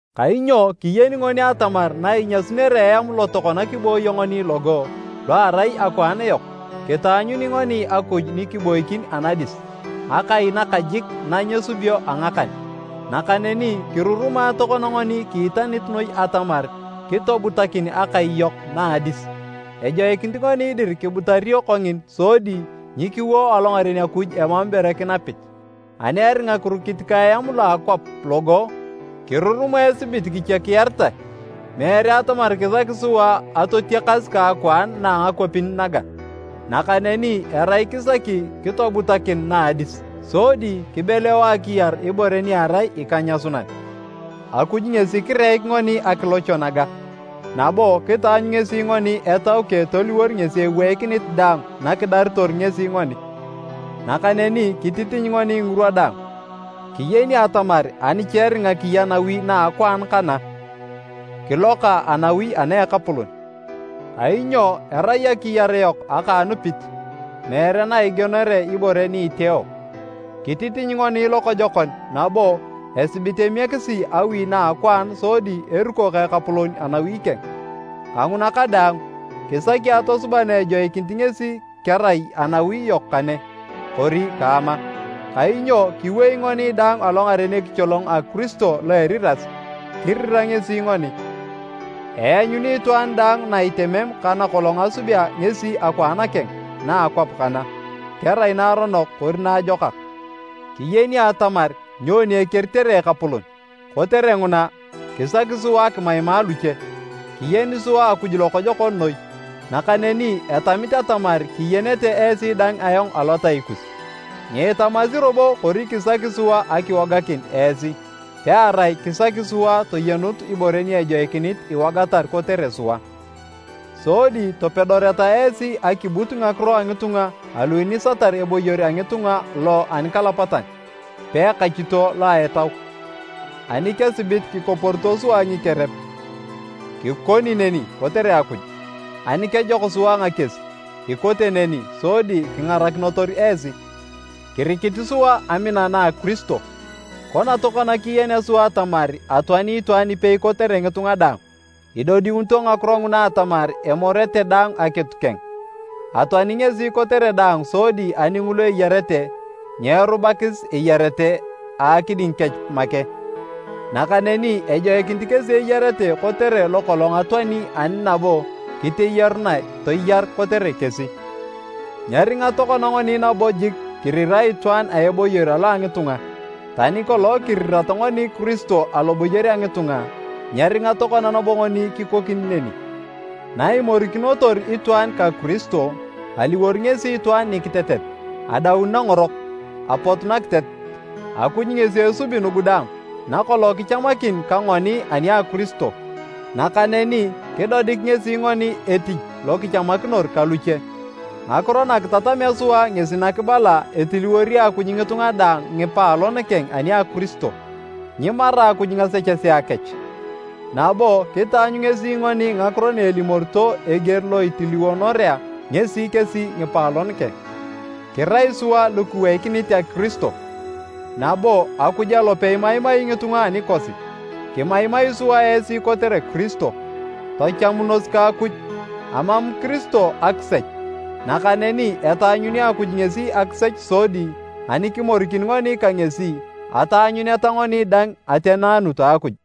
Kainyo kiyeni ngoni atamar na inyasunere eam lo tokona kibooyo ngoni logo, lo erai akwaan yok, kitaanyuni ngoni Akuj ni kiboikin anadis, akai nakajik na nyesubio a ngakan. Nakaneni kirurumae tokona ngoni kiitanit noi atamar kitobutakin akai yok na a adis. Ejoikinit ngoni dir kibutario kongina sodi nyikiwo alongaren Akuj emam ibore kinapit. Ani eringa kirukit ka eam lo a akwap logo, kirurumae esibit kichakiyaritae. Meere atamar kisaki sua atotiakas ka akwaan na a ngakwapin naga, nakaneni erai kisaki kitobutakin na a adis. Sodi kibeleo akiyar ibore ni erai ikenyasunan. Akuj ngesi kireik ngoni akilocho naga, nabo kitaanyu ngesi ngoni Etau keng toliwor ngesi eweikinit daang nakidaritor ngesi ngoni. Nakaneni kititiny ngoni ngirwa daang. Kiyeni atamar ani cha eringa kiya nawi na a akwaan kana, kiloka anawi ana a Ekapolon. Kainyo erai akiyar yok aka a anupit, meere na igienore ibore ni iteeo. Kititiny ngoni lokojokon nabo esibit emiekisi awi na a akwaan sodi eruko ka Ekapolon anawi keng. Kanguna kadaang, kisaki atosuba na ejoikinito ngesi kerai anawi yok kane, kori kaama. Kainyo kiwei ngoni daang alongaren ekicholong a Kiristo lo a eriras, kirira ngesi ngoni. Eanyuni itwaan daang na itemem ka nakolong asubea ngesi akwaan keng na a akwap kana, kerai naaronok kori naajokak. Kiyeni sua atamar nyoni ekeritere Ekapolon. Kotere nguna, kisaki sua akimaima luche. Kiyeni sua Akuj lokojokon noi, nakaneni etamit atamar kiyenete esi dang ayong alotai kus. Nyiitamasi robo kori kisaki sua akiwoganakin esi, pearai kisaki sua toyenut ibore ni ejoikinit iwogatar kotere sua. Sodi topedoreta esi akibut ngakiro a ngitunga alu inisatar eboyor a ngitunga lo anikalapatan, peekachito lo a etau. Ani kesibit kikoporito sua ngikerep, kikoni neni kotere Akuj. Ani kejok sua ngakies, ikote neni sodi kingarakinotor esi. Kirikit sua amina na a Kiristo. Kona tokona kiyenea sua atamar atoani itwaan ipei kotere ngitunga daang, idodiunito ngakiro nguna atamar emorete daang akitu keng. Atoani ngesi kotere daang sodi ani ngulu eyarete, nyeerubakis eyarete a akiding kech make. Nakaneni ejoikinit kesi eyarete kotere lokolong atoani ani nabo kiteyarunae toyar kotere kesi. Nyeringa tokona ngoni nabo jik kirirae itwaan a eboyor alo a ngitunga. Tani kolong kirirat ngoni Kiristo aloboyor a ngitunga, nyeringa tokona nabo ngoni kikoni neni. Naimorikinotor itwaan ka Kiristo, aliwor ngesi itwaan nikitetet, adaun nangorok, apotu nakiteat. Akuj ngesi esubi nugu daang, nakolong kichamakin ka ngoni ani a Kiristo. Nakaneni kidodik ngesi ngoni etich lo kichamakinor ka luche. Ngakiro na kitatamea sua ngesi nakibala etiliwori Akuj ngitunga daang ngipaalon keng ani a Kiristo. Nyimara Akuj ngasechesea kech, nabo kitaanyu ngesi ngoni Ngakiro na elimorito eger lo itiliwonorea ngesi kesi ngipaalon keng. Kirai sua lu kiweikinit a Kiristo, nabo Akuj alope imaimai ngitunga anikosi. Kimaimai sua esi kotere Kiristo, tachamunos ka Akuj! Amam Kiristo akisech. Nakaneni etaanyuni Akuj ngesi akisech sodi ani kimorikin ngoni ka ngesi, ataanyuneta ngoni dang ateneanut a Akuj.